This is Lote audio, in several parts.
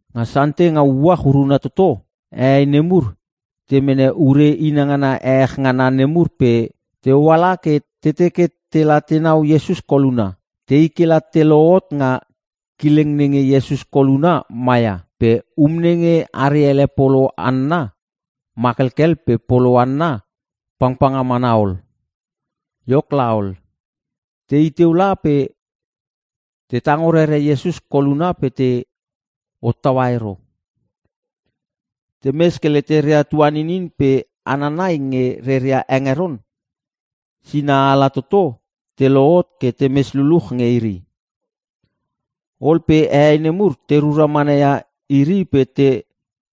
Nga Sante nga uach uruna toto, hehei nemur te mene ure inangana ehech ngana nemur pe te hoala ke te teke tela tenau Iesus koluna. Tei ke la te lohot nga kileng nenge Iesus koluna maia, pe um nenge are ele polo anna, ma kelkel pe polo anna pangpanga mana ol. Iok laol, tei teu la pe te tango rere Iesus koluna pe te hottaua ero. Temes ke leteria tuaninin pe hana nai nge reria hengeron sinaala toto te lohot ke temes luluch nge iri. Ol pe hehei nemur te rura manaia iri pe te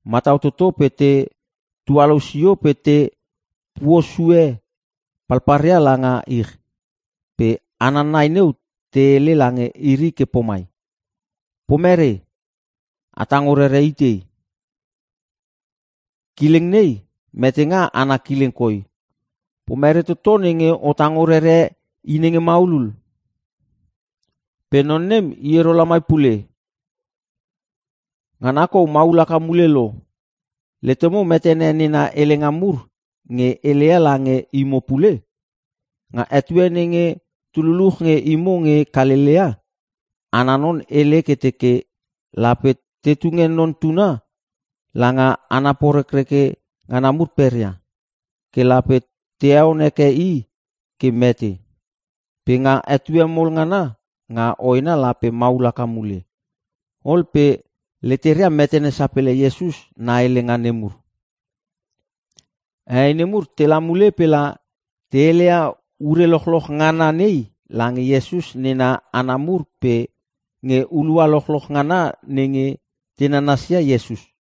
matau toto pe te tualou sio pe te puosue palpalria langa ich. Pe hana nai neu te hele lange iri ke pomai, “Pomere? A tango rere itei? Kileng nei metenga ana kileng koi pe pomere toto nenge o tango rere I nenge maulul. Pe non nem i ero lamai pule. Ngana kou maul haka mule lo. Letemo metene nena helenga mur nge heleia lange imo pule? Nga etue nenge tu luluch nge imo nge Kalelea, ana non hele ke teke, ‘Lape te tunge Non Tuna langa hana porekreke ngana mur peria, ke lape te heon heke i ke mete. Pe nga etue mol ngana nga hoena lape maul haka mule.’” Ol pe leteria metene sapele Iesus na helenga nemur. Hehei nemur tela mule pela te heleia ure lochloch ngana nei lange Iesus nena hana mur pe nge hulua lochloch ngana nenge te nananas ia Iesus.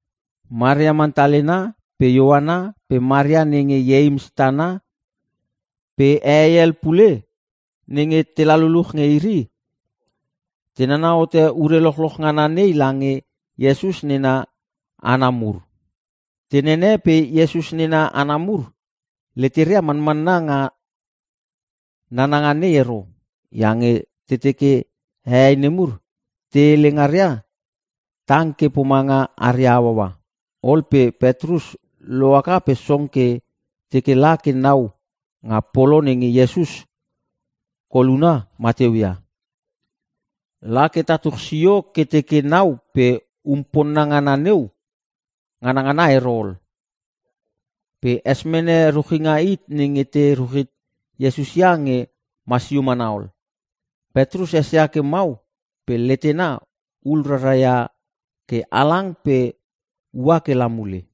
Maria Mantalena pe Ioana pe Maria nenge Ieims tana pe hehei hel pule nenge tela luluch nge iri, te nana hote ure lochloch ngana nei lange Iesus nena hana mur. Te nene pe Iesus nena hana mur leteria manmanna nga nananga nei ero, iange te teke hehei nemur te hele ngaria tang ke pomanga aria hauaua. Ol pe Petrus lohaka pe song ke teke la ke nau nga polo nenge Iesus koluna mateuia. La ke tatuch sio ke teke nau pe um ponna ngana neu nganngana ero ol. Pe es mene ruchinga hit nenge te ruchit Iesus ia nge masio mana ol. Petrus esia ke mau pe letena hul rara ia ke halang pe ua ke la mule.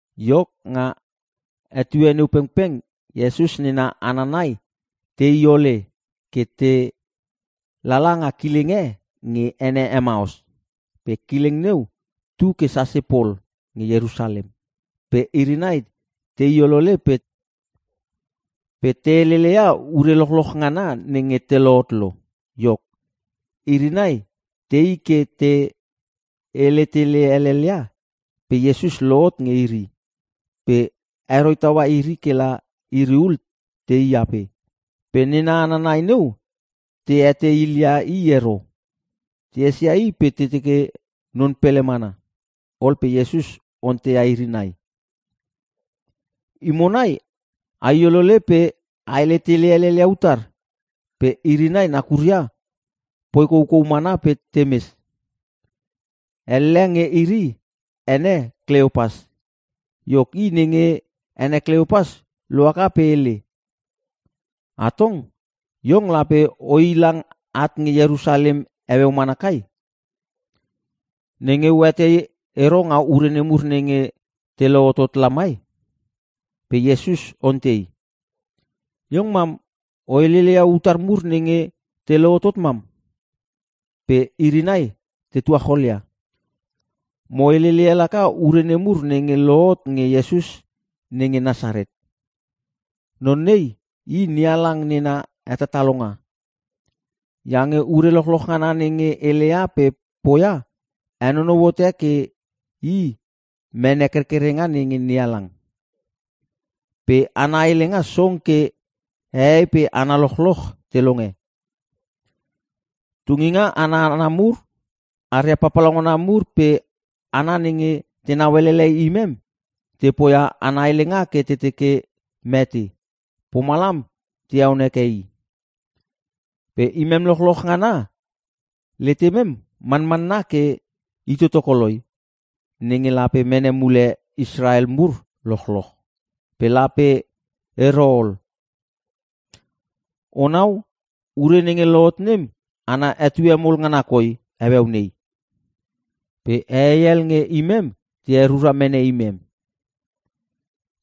Iok, nga etue neu pengpeng Iesus nena hana nai tei ole ke te lala nga kileng e nge ene Emaus. Pe kileng neu tu ke sase pol nge Ierusalem. Pe iri nai tei olole pe te heleleia ure lochloch ngana nenge lohot lo. Iok, iri nai tei ke te hele tele helelia pe Iesus lohot nge iri, pe heroi taua iri kela iri ul tei ape. Pe nena hana nai neu te etei hilia i ero. Te esia i pe te teke non pele mana. Ol pe Iesus onteia iri nai, “Imo nai ai olole pe a hele tele helel ia utar?” Pe iri nai nakuria poi koukou mana pe temes. Elle nge iri ene Kleopas. Iok, i nenge ene Kleopas lohaka pe hele, “Atong! Iong lape oi lang at nge Ierusalem heueu mana kai, nenge oetei ero nga ure nemur nenge te lohotot lamai?” Pe Iesus ontei, “Iong mam o heleleia utar mur nenge te lohotot mam?” Pe iri nai te tuacholia, “Mo heleleia laka ure nemur nenge lohot nge Iesus nenge Nasaret. Non nei i NeHalang nena hetatalonga. Iange ure lochloch ngana nenge heleia pe poia henonou hote ke i mene kerkerenga nenge NeHalang. Pe ana helenga song ke hehei pe hana lochloch te longe. Tunginga ana hana mur aria papalauna mur pe hana nenge tenau elele imem, te poia ana helenga ke te teke mete. Pomalam te heon heke i. Pe imem lochloch ngana letemem manmanna ke i toto koloi, nenge lape mene mule Israel mur lochloch. Pe lape ero ol. Onau ure nenge lohot nem ana etue mol ngana koi heueu nei. “Pe hehei hel nge imem te herura mene imem.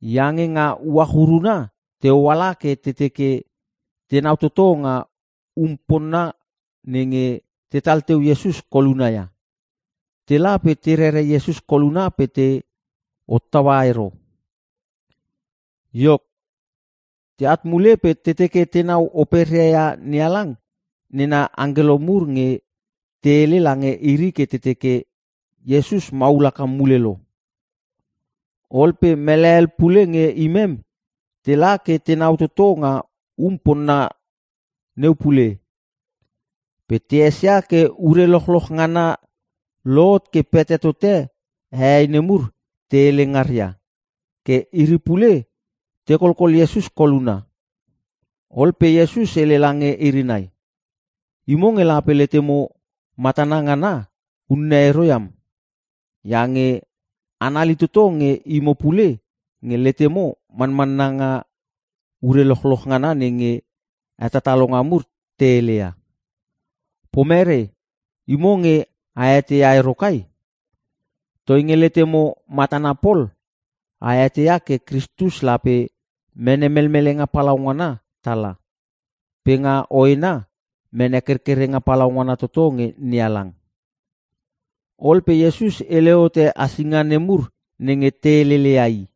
Iange nga uach uruna te oala ke te teke tenau toto nga um ponna nenge tetal teu Iesus koluna ia. Tela pe te rere Iesus koluna pe te hottaua ero. Iok, teat mule pe te teke tenau operia ia NeHalang nena angkelo mur nge te hele lange iri ke te teke, ‘Iesus maul haka mule lo.’ Ol pe mele hel pule nge imem tela ke tenau toto nga um ponna neu pule. Pe te esia ke ure lochloch ngana lohot ke pete tote hehei nemur te hele ngaria. Ke iri pule te kolkol Iesus koluna.” Ol pe Iesus hele lange iri nai, “Imo nge lape letemo matana ngana unne ero iam, iange anali toto nge imo pule nge letemo manmanna nga ure lochloch ngana nenge hetatalonga mur te heleia. Pomere? Imo nge a eteia ero kai? Toinge letemo matana pol, a eteia ke Kristus lape mene melmelenga palaungana tala, pe nga hoena, mene kerkerenga palaungana toto nge NeHalang.” Ol pe Iesus hele hote asinga nemur nenge te heleleia i.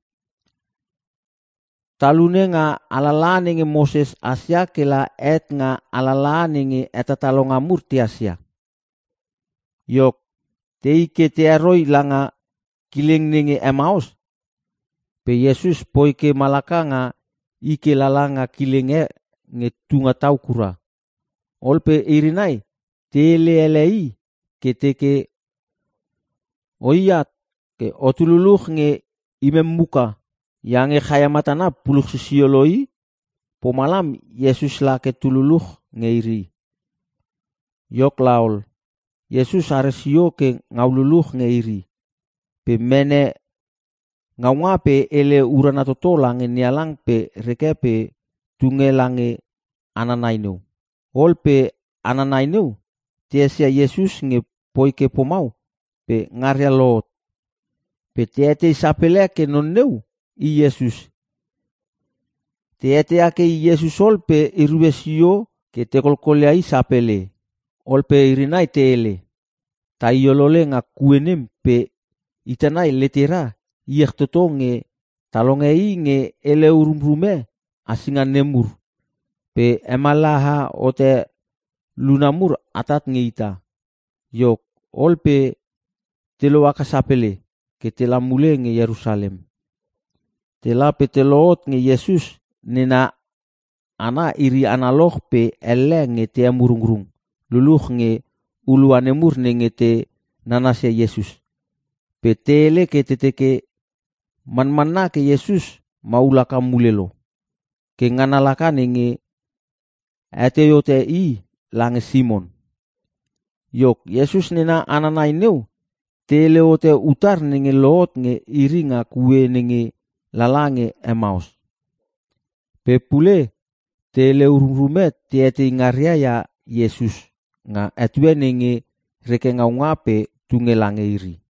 Talune nga alalaha nenge Moses hasia kela het nga alalaha nenge hetatalonga mur tehas ia. Iok, tei ke te heroi langa kileng nenge Emaus pe Iesus poi ke malaka nga i ke lala nga kileng e nge tunga tau kura. Ol pe iri nai te hele ele i ke te teke, “O iat ke otu luluch nge imem muka, iange chaia matana puluch sisio lo i.” Pomalam Iesus lake tu luluch nge iri. Iok laol, Iesus are sio ke ngau luluch nge iri, pe mene ngaunga pe hele urana toto lange NeHalang pe reke pe tunge lange hana nai neu. Ol pe hana nai neu te esia Iesus nge poi ke pomau pe ngaria lohot. Pe te etei sapele ke non neu i Iesus. Te eteia ke i Iesus ol pe erue sio ke te kolkolia i sapele. Ol pe iri nai te hele, “Tai olole nga kue nem pe ita nai letera iech toto nge ta longe i nge hele urumrume hasinga nemur, pe hemallaha hote luna mur atat nge ita.” Iok, ol pe te lohaka sapele ke tela mule nge Ierusalem. Tela pe te lohot nge Iesus nena hana iri analoch pe elle nge te emurungrung luluch nge hulua nemur nenge te nanasia Iesus. Pe te hele ke te teke, “Manmanna ke Iesus maul haka mule lo! Ke ngana laka nenge hetei hote i lange Simon!” Iok, Iesus nena hana nai neu te hele hote utar nenge lohot nge iri nga kue nenge lala nge Emaus, pe pule te hele ururume te etei ngaria ia Iesus nga etue nenge reke ngaunga pe tunge lange iri.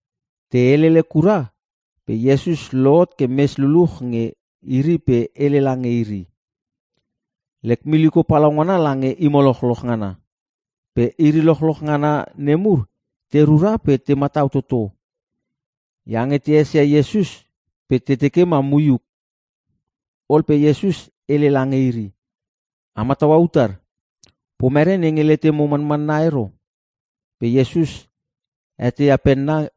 Te helele kura, pe Iesus lohot ke mes luluch nge iri pe hele lange iri, “Lek miliko palaungana lange imo lochloch ngana.” Pe iri lochloch ngana nemur te rura pe te matau toto iange te esia Iesus pe te teke ma moiuk. Ol pe Iesus hele lange iri, “A mataua utar? Pomere nenge letemo manmanna ero?” Pe Iesus heteia penna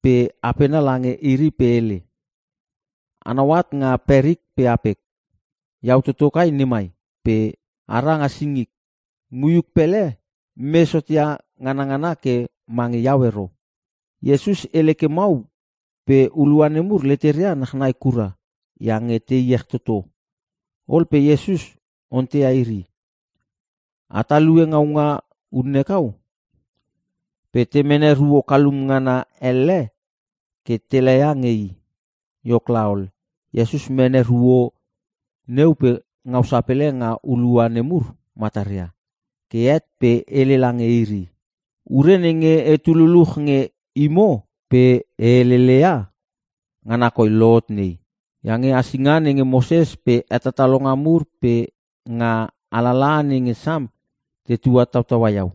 pe apena lange iri pe hele, “Anau at nga perik pe apek, iau toto kai nemai. Pe a ra nga singik, moiuk pele mes hotia nganangana ke mange iau ero.” Iesus hele ke mau pe hulua nemur leteria nachnai kura iange te iech toto. Ol pe Iesus onteia iri, “A talue ngaunga unne kau?” Pe te mene ruo kalum ngana elle ke te laia nge i. Iok laol, Iesus mene ruo neu pe ngau sapele nga hulua nemur mataria. Ke het pe hele lange iri, “Ure nenge etu luluch nge imo pe e heleleia, ngana koi lohot nei. Iange hasinga nenge Moses pe hetatalonga mur pe nga alalaha nenge Sam te tuatautaua iau.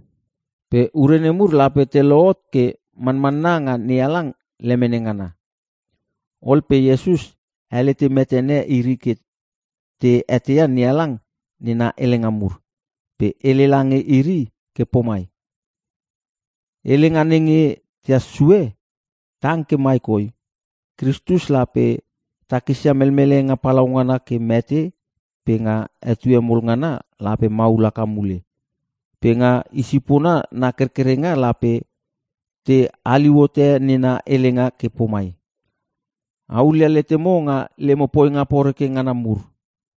Pe ure nemur lape te lohot ke mamanna nga NeHalang lemene ngana.” Ol pe Iesus helete metene iri ke te eteia NeHalang nena helenga mur. Pe hele lange iri ke pomai, “Helenga nenge tehas sue, tang ke mai koi: Kristus lape takisia melmelenga palaungana ke mete pe nga etue mol ngana lape maul haka mule. Pe nga i sipona na kerkerenga lape te haliu hote nena helenga ke pomai, ‘A hulia letemo nga lemo poinga poreke ngana mur.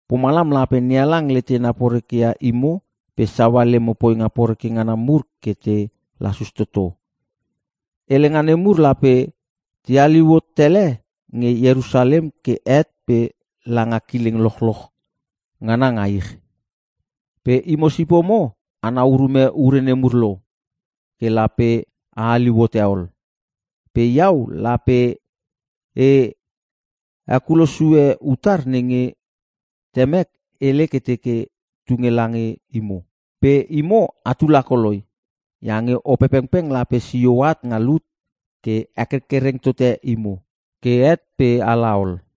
Pomalam lape NeHalang letena porekeia imo pe saua lemo poinga poreke ngana mur ke te lasus toto.’ Helenga nemur lape te haliu hot tele nge Ierusalem ke het pe langa kileng lochloch ngana nga ich. Pe imo sipomo anau urume ure nemur lo. Ke lape a haliu hote ol. Pe iau lape e hekulo sue utar nenge temek hele ke teke tunge lange imo. Pe imo atu lakoloi. Iange Opepengpeng lape sio at nga lut ke hekerkereng tote imo, ke het pe a laol.”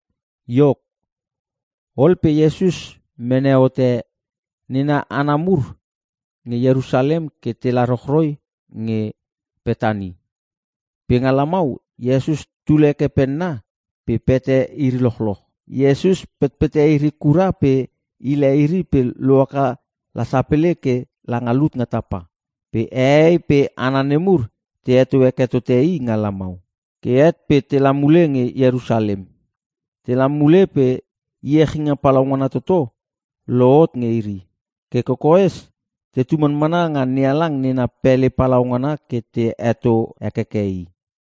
Iok, ol pe Iesus mene hote nena hana mur nge Ierusalem ke tela rochroi nge Petani. Pe nga lamau, Iesus tul heke penna pe pete iri lochloch. Iesus petpete iri kura pe hile iri pe lohaka la sapele ke langa lut nga tapa. Pe hehei pe hana nemur te heto heke tote i nga lamau. Ke het pe tela mule nge Ierusalem. Tela mule pe iechinga palaungana toto lohot nge iri. Ke kokoes tetu manmanna nga NeHalang nena pele palaungana ke te heto hekeke i.